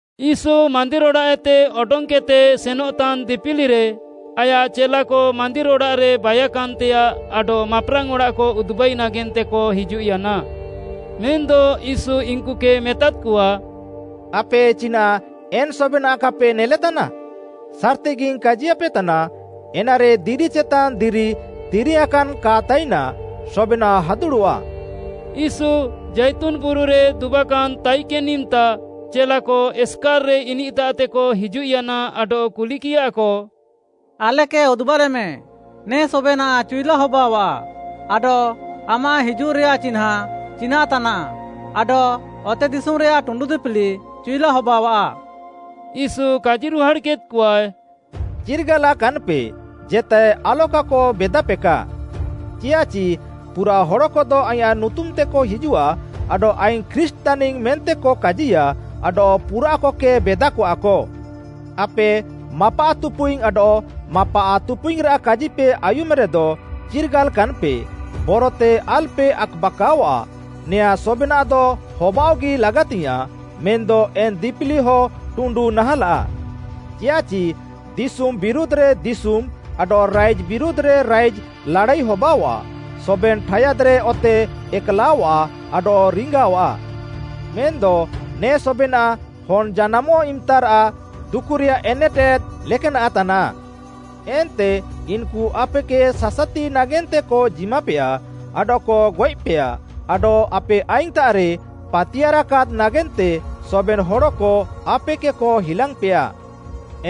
ୟୀଶୁ ମାନ୍ଦିର୍‌ ଅଡ଼ାଃଏତେ ଅଡଙ୍ଗ୍‌କେଦ୍‌ତେ ସେନଃତାନ୍‌ ଦିପିଲିରେ ଆୟାଃ ଚେଲାକ, ମାନ୍ଦିର୍‌ ଅଡ଼ାଃରେ ବାଇୟାକାନ୍‌ତେୟାଃ, ଆଡଃ ମାପ୍‌ରାଙ୍ଗ୍‌ ଅଡ଼ାଃକ ଉଦୁବାଇ ନାଗେନ୍ତେକ ହିଜୁଃୟାନା। ମେନ୍‌ଦ ୟୀଶୁ ଇନ୍‌କୁକେ ମେତାଦ୍‌କଆ, “ଆପେ ଚିନାଃ ଏନ୍‍ ସବେନାଃ କାପେ ନେଲେତାନା? ସାର୍‌ତିଗିଙ୍ଗ୍‌ କାଜିୟାପେତାନା, ଏନାରେ ଦିରି ଚେତାନ୍‍ ଦିରି ତିରିୟାଁକାନ୍‍ କା ତାଇନା, ସବେନାଃ ହାଦୁଡ଼ଃଆ।” ୟୀଶୁ ଜାଇତୁନ୍‌ ବୁରୁରେ ଦୁବାକାନ୍‌ ତାଇକେନ୍‌ ଇମ୍‌ତା ଚେଲାକ ଏସ୍‍କାର୍‍ରେ ଇନିଃତାଃତେକ ହିଜୁଃୟାନା ଆଡଃ କୁଲିକିୟାକ, “ଆଲେକେ ଉଦୁବାଲେମେ ନେ ସବେନାଃ ଚିଉଲା ହବାଅଃଆ ଆଡଃ ଆମାଃ ହିଜୁଃରେୟାଃ ଚିହ୍ନାଁ ଚିନାଃ ତାନାଃ ଆଡଃ ଅତେଦିଶୁମ୍‌ରେୟାଃ ଟୁଣ୍ଡୁ ଦିପିଲି ଚିଉଲା ହବାଅଆଃ?” ୟୀଶୁ କାଜିରୁହାଡ଼୍‌କେଦ୍‌କଆଏ, “ଚିର୍ଗାଲାକାନ୍‍ପେ, ଜେତାଏ ଆଲକାକ ବେଦାପେକା। ଚିୟାଃଚି ପୁରାଃ ହଡ଼କଦ ଆଇଁୟାଃ ନୁତୁମ୍‍ତେକ ହିଜୁଃଆ ଆଡଃ ‘ଆଇଙ୍ଗ୍‌ ଖ୍ରୀଷ୍ଟ୍‌ ତାନିଙ୍ଗ୍‌’ ମେନ୍ତେକ କାଜିୟା ଆଡଃ ପୁରାଃକକେ ବେଦାକଆକ। ଆପେ ମାପାଃତୁପୁଇଙ୍ଗ୍‌ ଆଡଃ ମାପାଃତୁପୁଇଙ୍ଗ୍‌ରାଃ କାଜିପେ ଆୟୁମେରେଦ, ଚିର୍ଗାଲାକାନ୍‌ପେ, ବରତେ ଆଲ୍‌ପେ ଆକ୍‌ବାକାଅଆଃ। ନେଆଁଁ ସବେନାଃଦ ହବାଅଃଗି ଲାଗାତିୟାଃଁ, ମେନ୍‌ଦ ଏନ୍‌ ଦିପିଲିହ ଟୁଣ୍ଡୁ ନାହାଁଲାଃ। ଚିୟାଃଚି ଦିଶୁମ୍‌ ବିରୁଧ୍‌ରେ ଦିଶୁମ୍‌ ଆଡଃ ରାଇଜ୍‌ ବିରୁଧ୍‌ରେ ରାଇଜ୍‌ ଲାଡ଼ାଇ ହବାଅଆଃ, ସବେନ୍‌ ଠାୟାଦ୍‌ରେ ଅତେ ଏକ୍‌ଲାଅଃଆ ଆଡଃ ରିଙ୍ଗାଅଃଆ। ମେନ୍‌ଦ ନେ ସବେନାଃ ହନ୍‌ ଜାନାମଃ ଇମ୍‌ତାରାଃ ଦୁକୁରେୟାଃ ଏନେଟେଦ୍‌ ଲେକାନାଃ ତାନାଃ। “ଏନ୍ତେ ଇନ୍‌କୁ ଆପେକେ ସାସାତିପେ ନାଗେନ୍ତେକ ଜିମାପେୟା ଆଡଃକ ଗଏଃପେୟା, ଆଡଃ ଆପେ ଆଇଙ୍ଗ୍‌ତାଃରେ ପାତିୟାର୍‌କାଦ୍‌ ନାଗେନ୍ତେ ସବେନ୍‌ ହଡ଼କ ଆପେକେକ ହିଲାଙ୍ଗ୍‌ପେୟା।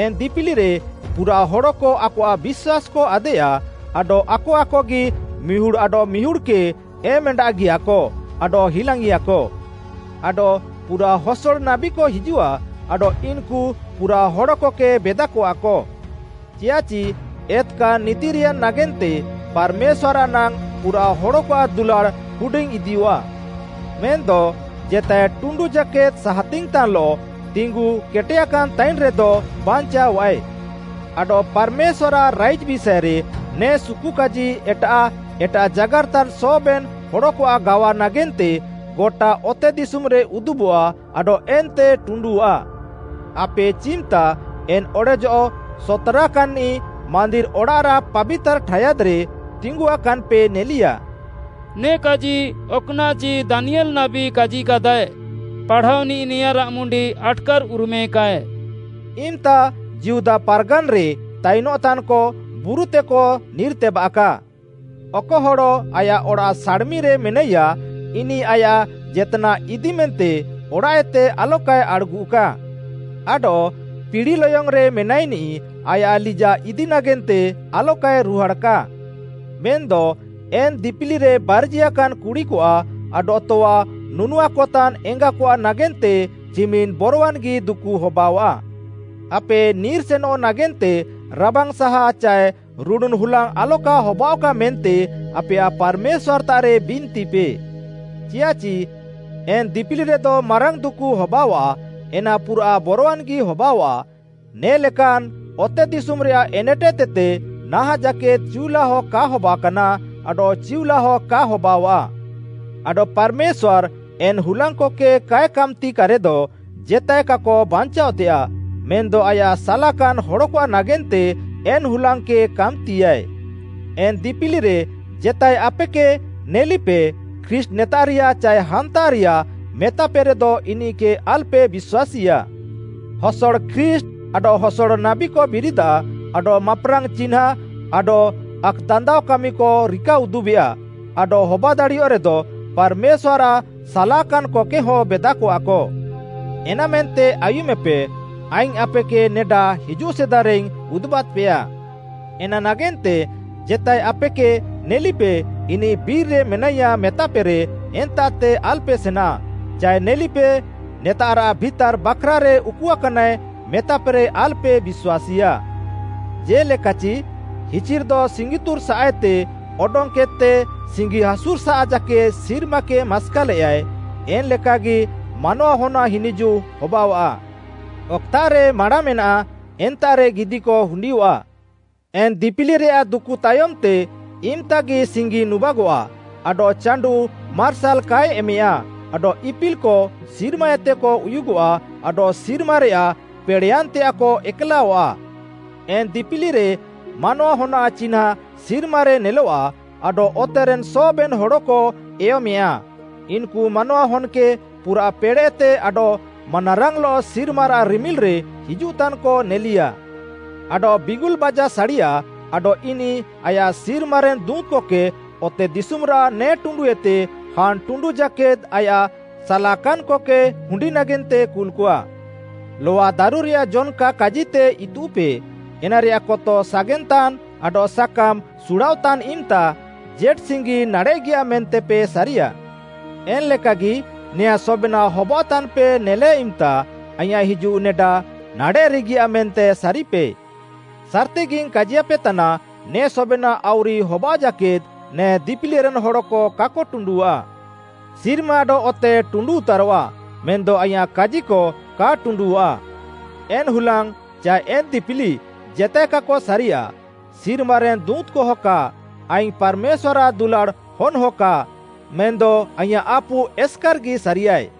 ଏନ୍‍ ଦିପିଲିରେ ପୁରାଃ ହଡ଼କ ଆକଆଃ ବିଶ୍ୱାସ୍‌କ ଆଦେୟା, ଆଡଃ ଆକ ଆକଗି ମିହୁଡ଼୍‌ ଆଡଃମିହୁଡ଼୍‌କେ ଏମ୍‌ଏଣ୍ଡାଗିୟାକ ଆଡଃ ହିଲାଙ୍ଗ୍‌ଇଆକ। ଆଡଃ ପୁରାଃ ହସଡ଼ ନାବୀକ ହିଜୁଃଆ ଆଡଃ ଇନ୍‌କୁ ପୁରାଃ ହଡ଼କକେ ବେଦାକଆକ। ଚିୟାଃଚି ଏତ୍‌କାନ୍‌ ନିତିର୍‌ୟାନ୍‍ ନାଗେନ୍ତେ ପାର୍‌ମେଶ୍ୱାର୍‌ଆଃ ନାଙ୍ଗ୍‌ ପୁରାଃ ହଡ଼କଆଃ ଦୁଲାଡ଼୍‌ ହୁଡିଙ୍ଗ୍‌ଇଦିୟଃଆ। ମେନ୍‌ଦ ଜେତାଏ ଟୁଣ୍ଡୁ ଜାକେଦ୍‌ ସାହାତିଙ୍ଗ୍‌ତାନ୍‌ଲଃ ତିଙ୍ଗୁ କେଟେୟାକାନ୍ ତାଇନ୍‌ରେଦ ବାଞ୍ଚାଅଃଆଏ। ଆଡଃ ପାର୍‌ମେଶ୍ୱାର୍‌ଆଃ ରାଇଜ୍‌ ବିଷାଏରେ ନେ ସୁକୁକାଜି ଏଟାଃ ଏଟାଃ ଜାଗାର୍‌ତାନ୍‌ ସବେନ୍‌ ହଡ଼କଆଃ ଗାୱା ନାଗେନ୍ତେ, ଗଟା ଅତେଦିଶୁମ୍‌ରେ ଉଦୁବଃଆ ଆଡଃ ଏନ୍ତେ ଟୁଣ୍ଡୁଃଆ। “ଆପେ ଚିମ୍‌ତା ଏନ୍‌ ‘ଅଡ଼େଜଃ ସତ୍‌ରାକାନ୍‌ନିଃ’ ମାନ୍ଦିର୍‌ ଅଡ଼ାଃରାଃ ପାବିତାର୍‌ ଠାୟାଦ୍‌ରେ ତିଙ୍ଗୁଆକାନ୍‍ପେ ନେଲିୟା,” ନେ କାଜି ଅକ୍‌ନାଃଚି ଦାନିୟେଲ୍‌ ନାବୀ କାଜିକାଦାଏ, ପାଢ଼ାଅନିଃ ନେଆଁଁରାଃ ମୁଣ୍ଡି ଆଟ୍‌କାର୍‍ଉରୁମେକାଏ। “ଇମ୍‌ତା ଯିହୁଦା ପାର୍‌ଗାନ୍‌ରେ ତାଇନଃତାନ୍‌କ ବୁରୁତେକ ନିର୍‌ତେବାଃକା। ଅକ ହଡ଼ ଆୟାଃ ଅଡ଼ାଃ ସାଡ଼୍‌ମିରେ ମେନାଇୟାଃ ଇନିଃ ଆୟାଃ ଜେତ୍‌ନାଃ ଇଦିମେନ୍ତେ ଅଡ଼ାଃଏତେ ଆଲକାଏ ଆଡ଼୍‌ଗୁଃକା। ଆଡଃ ପିଡ଼ି ଲୟଙ୍ଗ୍‌ରେ ମେନାଇନିଃ ଆୟାଃ ଲିଜାଃ ଇଦି ନାଗେନ୍ତେ ଆଲକାଏ ରୁହାଡ଼୍‌କା। ମେନ୍‌ଦ ଏନ୍‍ ଦିପିଲିରେନ୍‌ ବାର୍ଜିଆକାନ୍‍ କୁଡ଼ିକଆଃ ଆଡଃ ତଆ ନୁନୁଆକତାନ୍‍ ଏଙ୍ଗାକଆଃ ନାଗେନ୍ତେ ଚିମିନ୍‌ ବରୱାନ୍‌ଗି ଦୁକୁ ହବାଅଆଃ। ଆପେ ନିର୍‌ସେନଃ ନାଗେନ୍ତେ ରାବାଙ୍ଗ୍‌ସାହା ଚାଏ ରୁଡ଼ୁନ୍‌ ହୁଲାଙ୍ଗ୍‌ ଆଲକା ହବାଅଃକା ମେନ୍ତେ ଆପେୟାଃ ପାର୍‌ମେଶ୍ୱାର୍‌ତାଃରେ ବିନ୍ତିପେ। ଚିୟାଃଚି ଏନ୍‍ ଦିପିଲିରେଦ ମାରାଙ୍ଗ୍‌ ଦୁକୁ ହବାଅଆଃ ଏନା ପୁରାଃ ବରୱାନ୍‌ଗି ହବାଅଆଃ ନେ'ଲେକାନାଃ ଅତେଦିଶୁମ୍‌ରେୟାଃ ଏନେଟେଦ୍‌ଏତେ ନାହାଁଃ ଜାକେଦ୍‌ ଚିଉଲାଅ କା ହବାକାନା ଆଡଃ ଚିଉଲାଅ କା ହବାଅଆଃ। ଆଡଃ ପାର୍‌ମେଶ୍ୱାର୍‌ ଏନ୍‌ ହୁଲାଙ୍ଗ୍‌କକେ କାଏ କାମ୍‌ତିକାରେଦ ଜେତାଏ କାକ ବାଞ୍ଚାଅଃତେୟାଃ, ମେନ୍‌ଦ ଆୟାଃ ସାଲାକାନ୍‍ ହଡ଼କଆଃ ନାଗେନ୍ତେ ଏନ୍‍ ହୁଲାଙ୍ଗ୍‌କକେ କାମ୍‌ତିୟାଏ। “ଏନ୍‌ ଦିପିଲିରେ ଜେତାଏ ଆପେକେ, ‘ନେଲିପେ, ଖ୍ରୀଷ୍ଟ୍‌ ନେତାଃରିୟା’ ଚାଏ ‘ହାନ୍ତାଃରିୟା,’ ମେତାପେରେଦ ଇନିଃକେ ଆଲ୍‌ପେ ବିଶ୍ୱାସୀଆ। ହସଡ଼ ଖ୍ରୀଷ୍ଟ୍‌ ଆଡଃ ହସଡ଼ ନାବୀକ ବିରିଦାଃ ଆଡଃ ମାପ୍‌ରାଙ୍ଗ୍‌ ଚିହ୍ନାଁ ଆଡଃ ଆକ୍‌ଦାନ୍ଦାଅ କାମିକ ରିକାଉଦୁବେଆ, ଆଡଃ ହବାଦାଡ଼ିୟଃରେଦ ପାର୍‌ମେଶ୍ୱାର୍‌ଆଃ ସାଲାକାନ୍‍କକେହଁ ବେଦାକଆକ। ଏନାମେନ୍ତେ ଆୟୁମେପେ, ଆଇଙ୍ଗ୍‌ ଆପେକେ ନେଡା ହିଜୁଃ ସିଦାରେଇଙ୍ଗ୍‌ ଉଦୁବାଦ୍‌ପେୟା। “ଏନା ନାଗେନ୍ତେ, ଜେତାଏ ଆପେକେ, ‘ନେଲିପେ, ଇନିଃ ବିର୍‌ରେ ମେନାଇୟା’ ମେତାପେରେ, ‘ଏନ୍ତାଃତେ ଆଲ୍‌ପେ ସେନା’ ଚାଏ ନେଲିପେ, ‘ନେତାଃରାଃ ଭିତାର୍‌ ବାଖ୍‌ରାରେ ଉକୁକାନାଏ’ ମେତାପେରେ ଆଲ୍‌ପେ ବିଶ୍ୱାସୀଆ। ଜେ'ଲେକାଚି ହିଚିର୍‍ଦ ସିଙ୍ଗିତୁର୍‌ ସାଃଏତେ ଅଡଙ୍ଗ୍‌କେଦ୍‌ତେ ସିଙ୍ଗି ହାସୁର୍‌ସାଃ ଜାକେଦ୍‌ ସିର୍ମାକେ ମାସ୍କାଲେୟାଏ, ଏନ୍‌ ଲେକାଗି ମାନୱାହନ୍‌ଆଃ ହିନିଜୁଃ ହବାଅଆଃ। “ଅକ୍‌ତାଃରେ ମାଁଡ଼ା ମେନାଃ, ଏନ୍ତାଃରେ ଗିଦିକ ହୁଣ୍ଡିୟଃଆଃ। “ଏନ୍‍ ଦିପିଲିରେୟାଃ ଦୁକୁ ତାୟମ୍‌ତେ ଇମ୍‍ତାଗି ସିଙ୍ଗି ନୁବାଗଃଆ ଆଡଃ ଚାଣ୍ଡୁଃ ମାର୍ସାଲ୍‌ କାଏ ଏମେୟା ଆଡଃ ଇପିଲ୍‍କ ସିର୍ମାଏତେକ ଉୟୁଗଃଆ ଆଡଃ ସିର୍ମାରେୟାଃ ପେଡ଼େଃୟାନ୍‌ତେୟାଃକ ଏକ୍‌ଲାଅଃଆ। ଏନ୍‌ ଦିପିଲିରେ ମାନୱାହନ୍‌ଆଃ ଚିହ୍ନାଁ ସିର୍ମାରେ ନେଲଆଃ ଆଡଃ ଅତେରେନ୍‌ ସବେନ୍‌ ହଡ଼କ ଏୟମେଁୟା। ଇନ୍‌କୁ ମାନୱାହନ୍‌କେ ପୁରାଃ ପେଡ଼େଃତେ ଆଡଃ ମାନାରାଙ୍ଗ୍‌ଲଃ ସିର୍ମାରାଃ ରିମିଲ୍‌ରେ ହିଜୁଃତାନ୍‍କ ନେଲିୟା। ଆଡଃ ବିଙ୍ଗୁଲ୍‌ ବାଜା ସାଡ଼ିଆ, ଆଡଃ ଇନିଃ ଆୟାଃ ସିର୍ମାରେନ୍‌ ଦୁଁତ୍‌କକେ ଅତେଦିଶୁମ୍‌ରାଃ ନେ ଟୁଣ୍ଡୁଏତେ ହାନ୍‌ ଟୁଣ୍ଡୁ ଜାକେଦ୍‌ ଆୟାଃ ସାଲାକାନ୍‍କକେ ହୁଣ୍ଡି ନାଗେନ୍ତେ କୁଲ୍‌କଆ। “ଲଆଦାରୁରେୟାଃ ଜନ୍‌କା କାଜିତେ ଇତୁଃପେ, ଏନାରେୟାଃ କତ ସାଗେନ୍‍ତାନ୍‍ ଆଡଃ ସାକାମ୍‌ ସୁଡ଼ାଅଃତାନ୍ ଇମ୍‌ତା ଜେଟ୍‌ସିଙ୍ଗି ନାଡ଼େଃଗିଆ ମେନ୍ତେପେ ସାରିୟା। ଏନ୍‌ଲେକାଗି, ନେଆଁଁ ସବେନାଃ ହବାଅଃତାନ୍‌ପେ ନେଲେ ଇମ୍‌ତା, ଆଇଁୟାଃ ହିଜୁଃ ନେଡା ନାଡ଼େଃରେଗିଆଃ ମେନ୍ତେ ସାରିପେ। ସାର୍‌ତିଗିଙ୍ଗ୍‌ କାଜିୟାପେତାନା ନେ ସବେନାଃ ଆଉରି ହବାଅଃ ଜାକେଦ୍‌ ନେ ଦିପିଲିରେନ୍‌ ହଡ଼କ କାକ ଟୁଣ୍ଡୁଃଆ। ସିର୍ମା ଆଡଃ ଅତେ ଟୁଣ୍ଡୁଉତାରଃଆ, ମେନ୍‌ଦ ଆଇଁୟାଃ କାଜିକ କା ଟୁଣ୍ଡୁଃଆ। “ଏନ୍‌ ହୁଲାଙ୍ଗ୍‌ ଚାଏ ଏନ୍‌ ଦିପିଲି ଜେତାଏ କାକ ସାରିଆଃ, ସିର୍ମାରେନ୍‌ ଦୁଁତ୍‌କହ କା, ଆଇଙ୍ଗ୍‌ ପାର୍‌ମେଶ୍ୱାର୍‌ଆଃ ଦୁଲାଡ଼୍‌ ହନ୍‌ହ କା, ମେନ୍‌ଦ ଆଇଁୟାଃ ଆପୁ ଏସ୍‌କାର୍‌ଗି ସାରିଆଃଏ।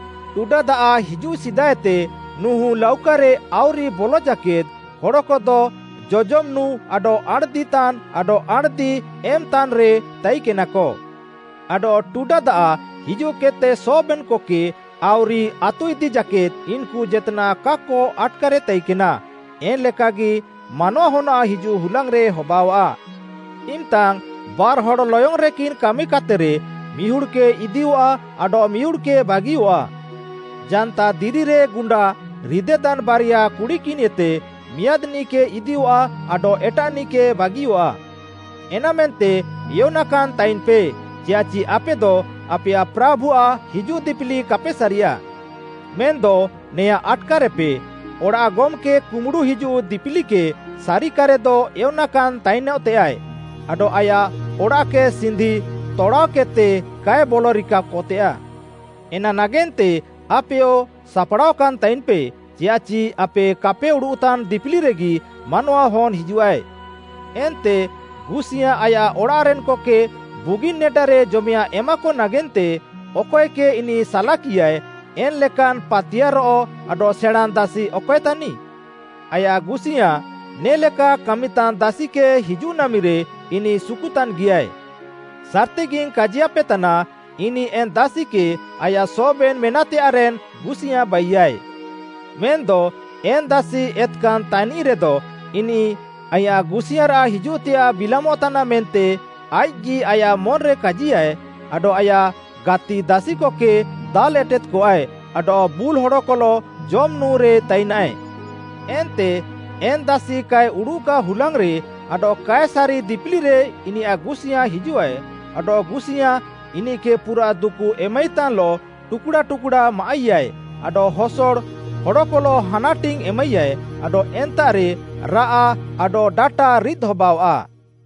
ଟୁଡା ଦାଆଃ ହିଜୁଃ ସିଦାଏତେ ନୁହୁଁ ଲାଉକାରେ ଆଉରି ବଲ ଜାକେଦ୍‌ ହଡ଼କଦ ଜଜମ୍‌ ନୁଁ ଆଡଃ ଆଣ୍‌ଦିତାନ୍‍ ଆଡଃ ଆଣ୍‌ଦି ଏମ୍‍ତାନ୍‍ରେ ତାଇକେନାକ। ଆଡଃ ଟୁଡା ଦାଆଃ ହିଜୁଃକେଦ୍‌ତେ ସବେନ୍‌କକେ ଆଉରି ଆତୁଇଦି ଜାକେଦ୍‌ ଇନ୍‌କୁ ଜେତ୍‌ନାଃ କାକ ଆଟ୍‌କାରେ ତାଇକେନା, ଏନ୍‌ ଲେକାଗି ମାନୱାହନ୍‌ଆଃ ହିଜୁଃ ହୁଲାଙ୍ଗ୍‌ରେ ହବାଅଆଃ। ଇମ୍‌ତାଙ୍ଗ୍‌ ବାର୍‌ହଡ଼୍‌ ଲୟଙ୍ଗ୍‌ରେକିନ୍ କାମିକାତେରେ, ମିହୁଡ଼୍‌କେ ଇଦିୟଃଆ ଆଡଃ ମିହୁଡ଼୍‌କେ ବାଗିଅଃଆ। ଜାନ୍ତାଦିରିରେ ଗୁଣ୍ଡା ରିଦେତାନ୍‌ ବାରିଆ କୁଡ଼ିକିନ୍‌ଏତେ ମିଆଁଦ୍‌ନିଃକେ ଇଦିୟଃଆ, ଆଡଃ ଏଟାଃନିଃକେ ବାଗିଅଃଆ। “ଏନାମେନ୍ତେ ଏୟନାକାନ୍‍ତାଇନ୍‌ପେ, ଚିୟାଃଚି ଆପେଦ ଆପେୟାଃ ପ୍ରାଭୁଆଃ ହିଜୁଃ ଦିପିଲି କାପେ ସାରିୟା। ମେନ୍‌ଦ ନେଆଁଁ ଆଟ୍‌କାରେପେ, ଅଡ଼ାଃ ଗମ୍‌କେ କୁମ୍ବୁଡ଼ୁ ହିଜୁଃ ଦିପିଲିକେ ସାରିକାରେଦ ଏୟନାକାନ୍ ତାଇନ୍‌ତେୟାଃଏ ଆଡଃ ଆୟାଃ ଅଡ଼ାଃକେ ସିନ୍ଧି ତଡ଼ାଅକେଦ୍‌ତେ କାଏ ବଲରିକାକତେୟାଃ। ଏନା ନାଗେନ୍ତେ ଆପେୟ ସାପ୍‌ଡ଼ାଅକାନ୍‍ ତାଇନ୍‌ପେ, ଚିୟାଃଚି ଆପେ କାପେ ଉଡ଼ୁଃତାନ୍‌ ଦିପିଲିରେଗି ମାନୱାହନ୍‌ ହିଜୁଃଆଏ। “ଏନ୍ତେ ଗୁସିୟାଁ ଆୟାଃ ଅଡ଼ାଃରେନ୍‌କକେ ବୁଗିନ୍‌ ନେଡାରେ ଜମେୟାଃଁ ଏମାକ ନାଗେନ୍ତେ ଅକଏକେ ଇନିଃ ସାଲାକିଆଏ, ଏନ୍‌ଲେକାନ୍‌ ପାତିୟାର୍‌ରଃ ଆଡଃ ସେଣାଁଁନ୍‌ ଦାସି ଅକଏ ତାନିଃ? ଆୟାଃ ଗୁସିୟାଁ ନେ'ଲେକା କାମିତାନ୍ ଦାସିକେ ହିଜୁଃ ନାମିରେ ଇନିଃ ସୁକୁତାନ୍‌ଗିୟାଏ। ସାର୍‌ତିଗିଙ୍ଗ୍‌ କାଜିୟାପେତାନା, ଇନିଃ ଏନ୍‍ ଦାସିକେ ଆୟାଃ ସବେନ୍‌ ମେନାଃତେୟାଃରେନ୍‍ ଗୁସିୟାଁ ବାଇୟାଏ। ମେନ୍‌ଦ ଏନ୍‌ ଦାସି ଏତ୍‌କାନ୍‌ ତାନିଃରେଦ, ଇନିଃ, ଆଇଁୟାଃ ଗୁସିୟାଁରାଃ ହିଜୁଃତେୟାଃ ବିଲାମଃତାନାଃ ମେନ୍ତେ ଆଇଃକ୍‌ଗି ଆୟାଃ ମନ୍‌ରେ କାଜିୟାଏ, ଆଡଃ ଆୟାଃ ଗାତିଦାସିକକେ ଦାଲ୍‌ ଏଟେଦ୍‌କଆଏ ଆଡଃ ବୁଲ୍‌ ହଡ଼କଲଃ ଜମ୍‌ ନୁଁରେ ତାଇନାଏ। ଏନ୍ତେ ଏନ୍‌ ଦାସି କାଏ ଉଡ଼ୁଃକା ହୁଲାଙ୍ଗ୍‌ରେ ଆଡଃ କାଏ ସାରି ଦିପିଲିରେ ଇନିୟାଃ ଗୁସିୟାଁ ହିଜୁଃଆଏ, ଆଡଃ ଗୁସିୟାଁ ଇନିଃକେ ପୁରାଃ ଦୁକୁ ଏମାଇତାନ୍‌ଲଃ ଟୁକ୍‌ଡ଼ା ଟୁକ୍‌ଡ଼ା ମାଆଃଇୟାଏ ଆଡଃ ହସଡ଼ ହଡ଼କଲଃ ହାନାଟିଙ୍ଗ୍‌ ଏମାଇୟାଏ ଆଡଃ ଏନ୍ତାଃରେ ରାଆଃ ଆଡଃ ଡାଟା ରିଦ୍‌ ହବାଅଆଃ।